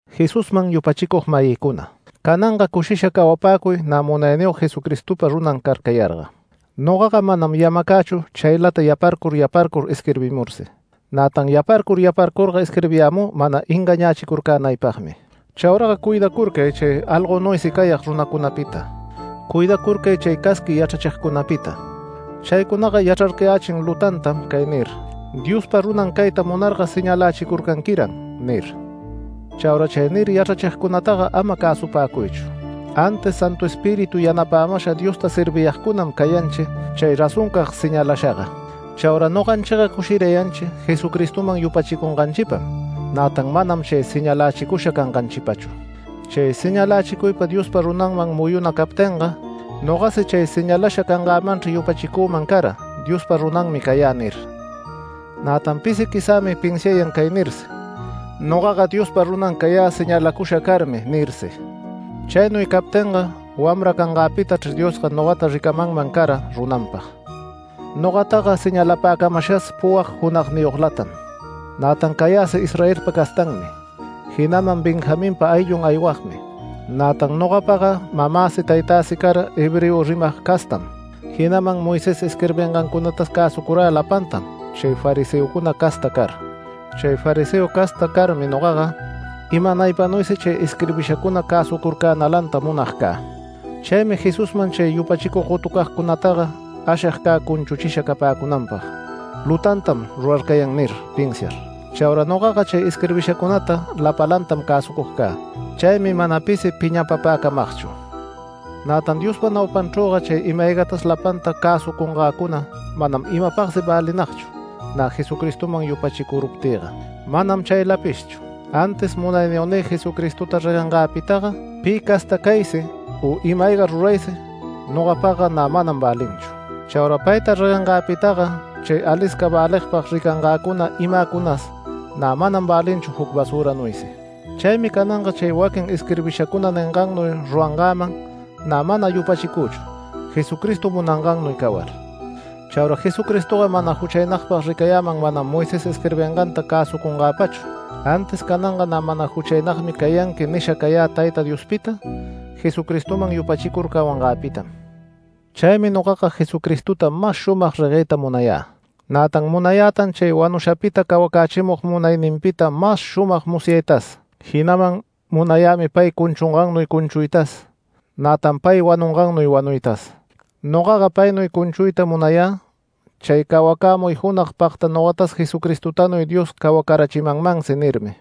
Jesusman yupachicug-mayïcuna, cananga cushisha cawapäcuy nä Munayniyog Jesucristopa runan carcayarga. Nogaga manam yamacächu chaylata yaparcur yaparcur isquirbimursi, nätan yarparcur yarparcurga isquirbiyämü mana engañächicurcänaypagmi. Chauraga cuidacurcay chay algonuysi cayag runacunapita. Cuidacurcay chay casqui yachrachigcunapita. Chaycunaga yachrarcayächin lutantam cay nir: “Diospa runan cayta munarga señalächicurcanquiran” nir. Chaura chay nir yachrachigcunataga ama cäsupäcuychu, antis Santu Espíritu yanapämasha Diosta serviyagcunam cayanchi, chay razoncag señalashaga. Chaura noganchiga cushirayanchi Jesucristoman yupachicunganchipam, nätan manam chay señalächicusha canganchipachu. Chay señalächicuypa Diospa runanman muyuna captinga, nogasi chay señalasha cangämanchri yupachicüman cara “Diospa runanmi cayä” nir. Nätan pisi quizämi pinsiayan cay nirsi: “Nogaga Diospa runan cayä señalacusha carmi” nirsi. Chaynuy captinga wamra cangäpitachr Diosga nogata ricamanman cara runanpag. Nogataga señalapäcamashas puwag junagniyoglatam. Nätan cayäsi Israelpa castanmi, jinaman Benjaminpa ayllun aywagmi. Nätan nogapaga mamäsi, taytäsi cara hebreo rimag castam, jinaman Moisés isquirbingancunatas cäsucurä lapantam chay fariseocuna casta car. Chay fariseo casta carmi nogaga, imanaypanuysi chay isquirbishacuna cäsucurcänalanta munag cä. Chaymi Jesusman chay yupachicug gotucagcunataga ashig cä cunchuchisha capäcunanpag “Lutantam rurarcayan” nir pinsiar. Chaura nogaga chay isquirbishacunata lapalantam cäsucug cä. Chaymi mana pisi piñapapäcamagchu. Nätan Diospa naupanchrüga chay ima-aygatas lapanta cäsucungäcuna manam imapagsi välinagchu, nä Jesucristoman yupachicuruptïga. Manam chaylapishchu, antis Munayniyognï Jesucristota reguengäpitaga pi casta caysi u ima-ayga ruraysi nogapagga nä manam välinchu. Chaura payta reguengäpitaga chay alisca väligpag ricangäcuna imäcunas nä manam välinchu juc basüranuysi. Chaymi cananga chay waquin isquirbishacuna ningannuy rurangäman nä mana yupachicüchu, Jesucristo munangannuy cawar. Chaura Jesucristoga mana juchaynagpag ricayäman manam Moisés isquirbinganta cäsucungäpachu, antis cananga “Nä mana juchaynagmi cayanqui” nisha cayä Tayta Diospita, Jesucristoman yupachicur cawangäpitam. Chaymi nogaga Jesucristota mas shumag regueyta munayä. Nätan munayätan chay wanushapita cawacächimug munayninpita mas shumag musyaytas, jinaman munayämi pay cunchungannuy cunchuytas, nätan pay wanungannuy wanuytas. Nogaga paynuy cunchuyta munayä “Chay cawacämuy junag pagta nogatas Jesucristotanuy Dios cawacarachimanmansi” nirmi.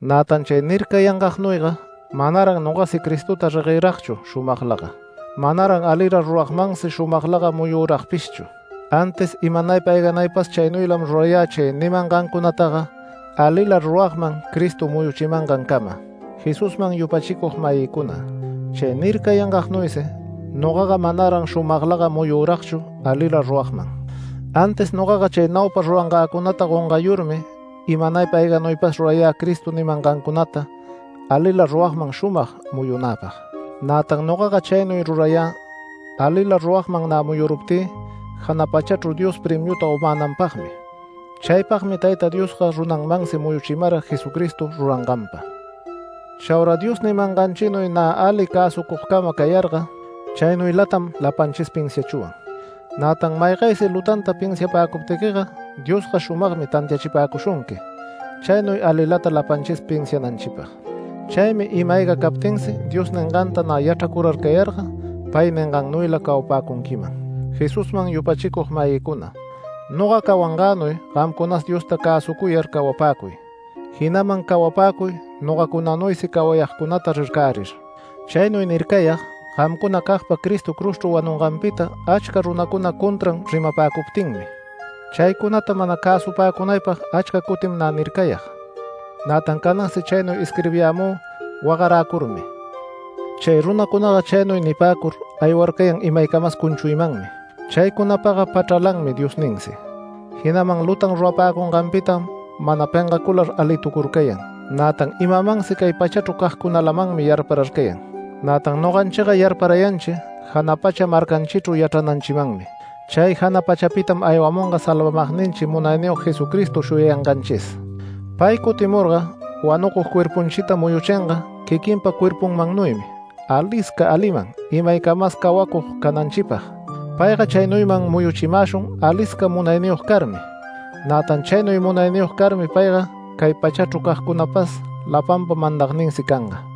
Nätan chay nircayangagnuyga manaran nogasi Cristota regueragchu shumaglaga. Manaran alila ruragmansi shumaglaga muyuragpishchu, antis imanaypa ayganaypas chaynuylam rurayä chay nimangancunataga alila ruragman Cristo muyuchimangancama. Jesusman yupachicug-mayïcuna, chay nircayangagnuysi nogaga manaran shumaglaga muyuragchu alila ruragman. Antis nogaga chay naupa rurangäcunata gongayurmi imanaypa ayganaypas rurayä Cristo nimangancunata alila ruragman shumag muyunäpag. Nätan nogaga chaynuy rurayä alila ruragman nä muyuruptï jana pachachru Dios premiuta gomänanpagmi. Chaypagmi Tayta Diosga runanmansi muyuchimara Jesucristo ruranganpa. Chaura Dios nimanganchinuy nä ali cäsucugcama cayarga, chaynuylatam lapanchis pinsiachwan. Nätan maygaysi lutanta pinsiapäcuptiquiga Diosga shumagmi tantiachipäcushunqui, chaynuy alilata lapanchis pinsiananchipag. Chaymi ima-ayga captinsi Dios ninganta nä yachracurayarga pay ningannuyla cawapäcunquiman. Jesusman yupachicug-mayïcuna, noga cawangänuy gamcunas Diosta cäsucuyar cawapäcuy, jinaman cawapäcuy nogacunanuysi cawayagcunata rircärir. Chaynuy nircayag, gamcunacagpa Cristo cruzchru wanunganpita achca runacuna contra rimapäcuptinmi. Chaycunata mana cäsupäcunaypag achca cutim nä nircayag. Nätan canansi chaynuy isquirbiyämü wagaräcurmi. Chay runacunaga chaynuy nipäcur aywarcayan imaycamas cunchuymanmi. Chaycunapaga pachralanmi Diosninsi, jinaman lutan rurapäcunganpitam mana pengacular alitucurcayan. Nätan imamansi cay pachachru cagcunalamanmi yarpararcayan. Nätan noganchiga yarparayanchi jana pacha marcanchichru yachrananchimanmi. Chay jana pachapitam aywamunga salvamagninchi Munayniyog Jesucristo shuyayanganchis. Pay cutimurga wanucug cuerpunchita muyuchinga quiquinpa cuerpunmannuysi alisca aliman imaycamas cawacug cananchipag. Payga chaynuyman muyuchimäshun alisca munayniyog carmi. Nätan chaynuy munayniyog carmi payga cay pachachru cagcunapas lapanpa mandagninsi canga.